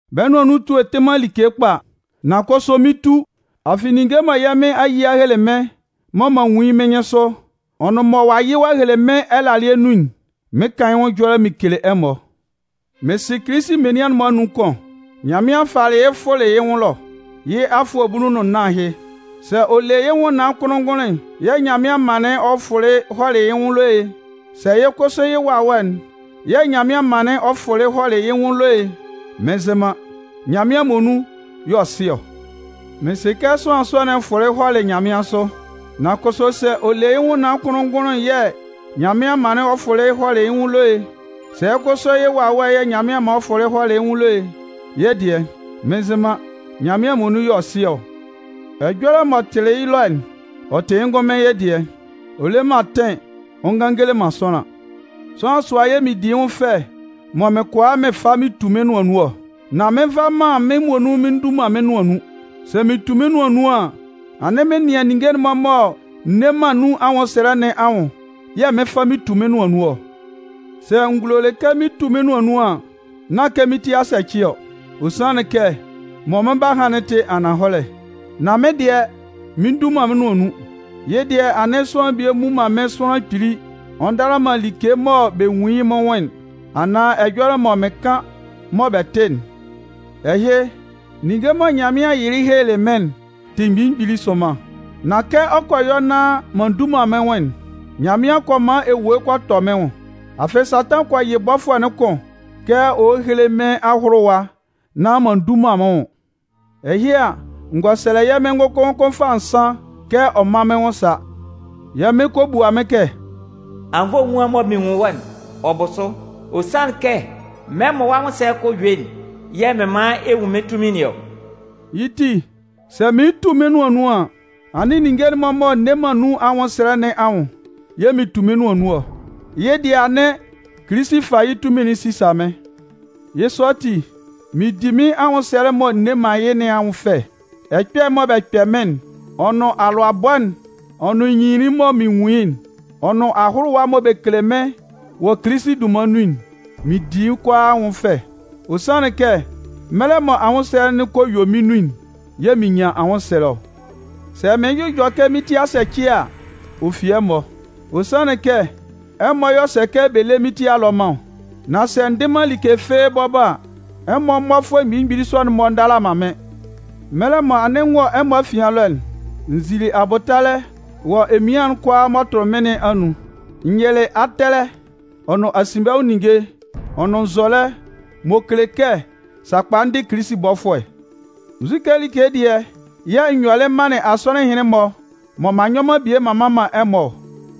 Bɛ́ nʋan nun etue'n tɩ man like kpa. Nan kʋsʋ mɩn 'tu, afɩ ninnge mɔ yɛ́ Mɩn a yɩ a hele mɩ́n mɔ m'an nwun yɩ́ mɩ́n nyɩnsʋ, ɔ nʋn mɔ ɔ'a yɩ ɔ'a hele mɩ́n ɛlalɩɛ nun'n, mɩn 'kan yɩ́ nwʋn ɛjɔlɛ mɩn 'kele ɛmɔ. Mɩn sɩ Kilisi menian'n-mɔ anun kʋn. Nyanmɩan falɩ yɩ́ fʋlɩ yɩ́ nwʋn ɛlɔ. Yɩ́ afʋɛ bulu nʋn nnan ahɩ. (Sɛ ɔ le yɩ́ nwʋnnaan kʋnlʋn-ngʋnlʋn'n yɛ̂ Nyanmɩan manlɩn ɔ fʋlɩ hɔlɩ yɩ́ nwʋn ɛlɔ e, sɛ kʋsʋ yɩ́ wawɛ'n yɛ̂ Nyanmɩan manlɩn ɔ fʋlɩ hɔlɩ yɩ́ nwʋn ɛlɔ e, mɩn nzɩ man, Nyanmɩan muonun y'ɔ sɩ ɔ.) Mɩn sɩ kɛ sʋanlan sɔ'n fʋlɩ hɔlɩ nyanmɩansʋ. (Nan kʋsʋ sɛ ɔ le yɩ́ nwʋnnaan kʋnlʋn-ngʋnlʋn'n yɛ̂ Nyanmɩan manlɩn ɔ fʋlɩ hɔlɩ yɩ́ nwʋn ɛlɔ e, sɛ kʋsʋ yɩ́ wawɛ'n yɛ̂ Nyanmɩan manlɩn ɔ fʋlɩ hɔlɩ yɩ́ nwʋn ɛlɔ e, yɩ́ dɩɛ, mɩn nzɩ man, Nyanmɩan muonun y'ɔ sɩ ɔ.) Ɛjɔlɛ m'ɔ tɩlɩ yɩ́ ɛlɔ'n, ɔ tɩ yɩ́ ngʋnmɩn yɩ́ dɩɛ. Ɔ le man atɩn ɔ ngan ɔ ngele man sʋanlan. Sʋanlan sʋa yɛ̂ mɩn di yɩ́ nwʋn fɛ mɔ mɩn kʋala mɩn fa mɩn tu mɩ́n nʋan nun ɔ. Nan mɩn nva man mɩ́n muonun mɩn ndu man mɩ́n nʋan nun. Sɛ mɩn 'tu mɩ́n nʋan nun an, anɩn mɩn nɩan ninnge'n-mɔ mɔ n nne man nun anwʋnsɛlɛ nɩn anwʋn yɛ̂ mɩn 'fa mɩn 'tu mɩ́n nʋan nun ɔ. Sɛ n gulolɩ kɛ mɩn 'tu mɩ́n nʋan nun an, nán kɛ mɩ́n ti a sɛcɩ ɔ, ɔ sanlɩn kɛ mɔ mɩn 'ba han'n tɩ ananhɔlɛ. Nan mɩ́n dɩɛ, mɩn ndu man mɩ́n nʋan nun. Yɩ́ dɩɛ anɩn, sʋanlan bie mmu man mɩ́n sʋanlan kpili ɔ ndala man like mɔ bɛ nwun yɩ́ mɩ́n nwʋn'n, anaan ɛjɔlɛ mɔ mɩn kan mɔ bɛ tɩ'n. Ɛhɩ, ninnge mɔ Nyanmɩan yɩlɩ helelɩ mɩ́n'n tɩ mgbili mgbili sʋnman. Nan kɛ ɔ kɔ yɔ nán m'an ndu man mɩ́n nwʋn'n, Nyanmɩan kɔ man ewue kɔ tɔ mɩ́n nwʋn. Afɩ, Satan kɔ yɩ yɩ́ bɔfʋɛ'n kʋn kɛ ɔ héle mɩ́n ahʋlʋwa nán m'an ndu man mɩ́n nwʋn. Ɛhɩ a, n gɔ sɛlɛ yɛ́ Mɩn ngʋkʋn ngʋkʋn fâ nsan kɛ ɔ mán mɩ́n nwʋn sá. Yɛ́ Mɩn kɔ bua mɩ́n kɛ: “Anwunnvoe'n mɔ mɩn nwun wɔ́'n, ɔ bʋ sʋ. Ɔ sanlɩn kɛ mɛlɛ mɔ wɔ́ anwʋnsɛlɛ'n kɔ yue'n yɛ̂ mɩn man ɛ nwun mɩ́n tunmin nɩn ɔ.” Yɩ́ ti, sɛ mɩn 'tu mɩ́n nʋan nun an, anɩn ninnge'n-mɔ mɔ n nne man nun anwʋnsɛlɛ nɩn anwʋn yɛ̂ mɩn tu mɩ́n nʋan nun ɔ. Yɩ́ dɩɛ anɩn, Kilisi fa yɩ́ tunmin'n sisa mɩ́n. Yɩ́ sɔ ati, mɩn di mɩ́n anwʋnsɛlɛ'n mɔ n nne man yɩ́ nɩn anwʋn fɛ. Ɛkpɛ'n mɔ bɛ kpɛ mɩ́n'n, ɔ nʋn alʋabɔ'n, ɔ nʋn nyinlinlin'n mɔ mɩn nwun yɩ́'n, ɔ nʋn ahʋlʋwa'n mɔ bɛ kele mɩ́n wɔ Kilisi dunman nun'n, mɩn di yɩ́ kʋalaa anwʋn fɛ. Ɔ sanlɩn kɛ mɛlɛ mɔ anwʋnsɛlɛ kɔ yue mɩ́n nun'n yɛ̂ mɩn nyan anwʋnsɛlɛ ɔ. Sɛ mɩɩn jʋjɔ kɛ mɩ́n ti a sɛcɩ a, ɔ fi ɛmɔ. Ɔ sanlɩn kɛ ɛmɔ y'ɔ sɛ kɛ bɛ lé mɩ́n ti alɔman ɔ. Nan sɛ n dɩ man like fɩ́ɩ́ bɔbɔ a, ɛmɔ mmɔfʋɛ mgbili mgbili sɔ'n-mɔ ndala man mɩ́n. Mɛlɛ mɔ anɩn n wɔ ɛmɔ afian ɛlɔ'n, n zili abʋtalɛ wɔ emian kʋalaa m'ɔ tʋlɩ mɩ́n nɩn anun. N yɩlɩ atɛlɛ ɔ nʋn asinbɛnwʋn ninnge ɔ nʋn nzɔlɛ m'ɔ kele kɛ sakpa n dɩ Kilisi bɔfʋɛ. Nzu like dɩɛ yɛ̂ n yɔlɩ m manlɩn asɔnɩn ɛhɩnlɩn-mɔ mɔ m'an nyɔ man bie m'an mman man ɛmɔ ɔ?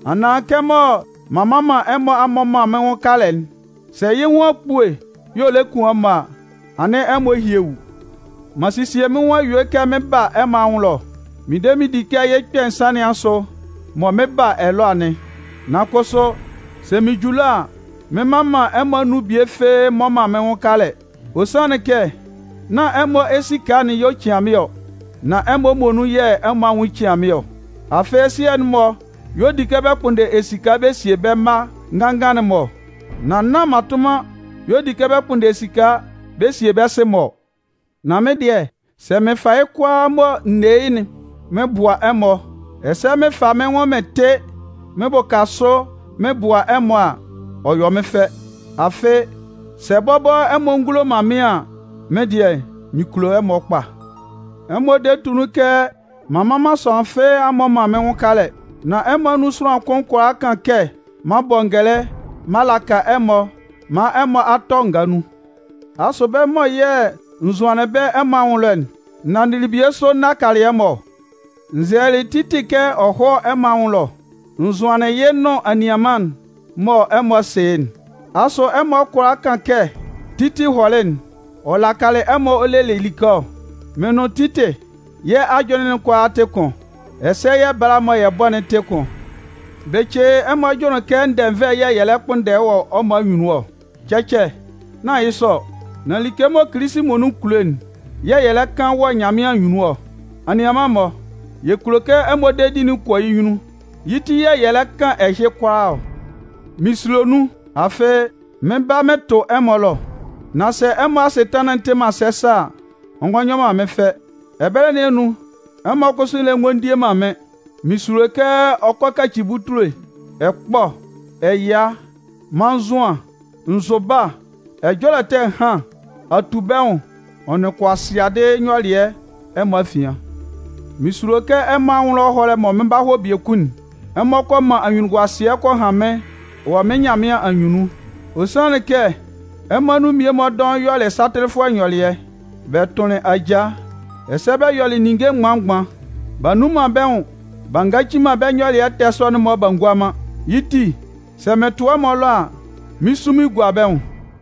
Anaan kɛmɔ m'an mman ɛmɔ a mmɔ man mɩ́n nwʋn kalɛ'n, sɛ yɩ́ nwʋn akpue y'ɔ lɛ kun ɛmɔ a, anɩn ɛmɔ ehyiewu! M'an sesie mɩ́n nwʋn a yue kɛ mɩɩn ba ɛmɔ anwʋn ɛlɔ. Mɩn de mɩn di kɛ yɩ́ kpɛ̂ nsan nɩn asʋ mɔ mɩn 'ba ɛlɔ anɩn. Nan kʋsʋ, sɛ mɩn ju ɛlɔ a, mɩn mman ɛmɔ anun bie fɩ́ɩ́ mmɔ man mɩ́n nwʋn kalɛ. Ɔ sanlɩn kɛ nán ɛmɔ esika'n y'ɔ cian mɩ́n ɔ, nan ɛmɔ muonun yɛ̂ ɛmɔ anwʋn cian mɩ́n ɔ. Afɩ, sɩɛ'n-mɔ y'ɔ di kɛ bɛ kpʋnndɛ esika bɛ sie bɛ́ mma nganngan'n-mɔ ɔ, nan nán mmatʋnman y'ɔ di kɛ bɛ kpʋnndɛ esika bɛ sie bɛ́ sɩ-mɔ ɔ. Nan mɩ́n dɩɛ, sɛ mɩn fa yɩ́ kʋalaa mɔ n ne yɩ́'n mɩn bʋa ɛmɔ, ɛsɛ mɩn fa mɩ́n nwʋn mɩn tɩ mɩn bʋka sʋ mɩn bʋa ɛmɔ a, ɔ yɔ mɩ́n fɛ. Afɩ, sɛ bɔbɔ ɛmɔ ngulo man mɩ́n an, mɩ́n dɩɛ, mɩn kulo ɛmɔ kpa. Ɛmɔ de tʋ nun kɛ m'an mman sʋanlan fɩ́ɩ́ a mmɔ man mɩ́n nwʋn kalɛ. Nan ɛmɔ anun sʋanlan kʋn kʋala kan kɛ m'an bɔ ngɛlɛ m'an laka ɛmɔ maan ɛmɔ a tɔ ngaa nun. Asʋ bɛ́ mɔ yɛ̂ n zʋanlɩn bɛ́ ɛmɔ anwʋn ɛlɔ'n, n nanndɩlɩ bie sʋ n nakalɩ ɛmɔ ɔ? N zɛlɛlɩ Titɩ kɛ ɔ hɔ́ ɛmɔ anwʋn ɛlɔ. N zʋanlɩn yɩ́ nʋn anianman'n mɔ ɛmɔ sɩ yɩ́'n. Asʋ ɛmɔ kʋala kan kɛ Titɩ hɔlɩ'n, ɔ lakalɩ ɛmɔ ɔ lelɩ like ɔ? Mɩn nʋn Titɩ, yɛ́ ajʋnlɩn'n kʋalaa tɩ kʋn, ɛsɛ yɛ́ bala mɔ yɛ́ bɔ'n tɩ kʋn. Bɩcɩ, ɛmɔ jʋnlɩn kɛ ndɛnvɛ yɛ̂ yɛ lɛ kpʋnndɛ wɔ ɛmɔ anyunnun ɔ? Cɛcɛ, nán yɩ́ sɔ ɔ. Nan like mɔ Kilisi muonun kulo'n yɛ̂ yɛ lɛ kan wɔ Nyanmɩan anyunnun ɔ. Anianman-mɔ, yɛ kulo kɛ ɛmɔ dedi'n kɔ yɩ́ nyunnun, yɩ́ ti yɛ̂ yɛ lɛ kan ɛhɩ kʋalaa ɔ. Mɩn sulo nun, afɩ, mɩn ba mɩn tʋ ɛmɔ ɛlɔ, nán sɛ ɛmɔ asɩtanlan'n tɩ man sɛsɛ a, ɔ ngɔ yɔ man mɩ́n fɛ. Ɛbɛlɛ nɩn anun, ɛmɔ kʋsʋ lɛ ngɔ tie man mɩ́n. Mɩn sulo kɛ ɔ kɔ kaci butule, ɛkpɔ, ɛya, mannzʋan, nzʋba, ɛjɔlɛ ɛtɛ ɛhan, atubɛnwʋn ɔ nʋn kʋasɩadɩ nyɔlɩɛ ɛmɔ afian. Mɩn sulo kɛ ɛmɔ anwʋn ɛlɔ ɛhɔlɛ'n mɔ mɩn 'ba hɔ biekun'n, ɛmɔ kɔ man anyunnunguasɩɛ kɔ han mɩ́n wɔ mɩ́n Nyanmɩan anyunnun. Ɔ sanlɩn kɛ ɛmɔ anun mmie-mɔ dɔʋn yɔlɩ satɩlɩfʋɛ nyɔlɩɛ, bɛ tʋnlɩn ajaa, ɛsɛ bɛ yɔlɩ ninnge mgban mgban. B'a nnun man bɛ́ nwun b'a nyaci man nyɔlɩɛ ɛtɛ sɔ'n-mɔ b'a ngua man. Yɩ́ ti, sɛ mɩn tʋ ɛmɔ ɛlɔ a, mɩn 'sun mɩn gua bɛ́ nwʋn.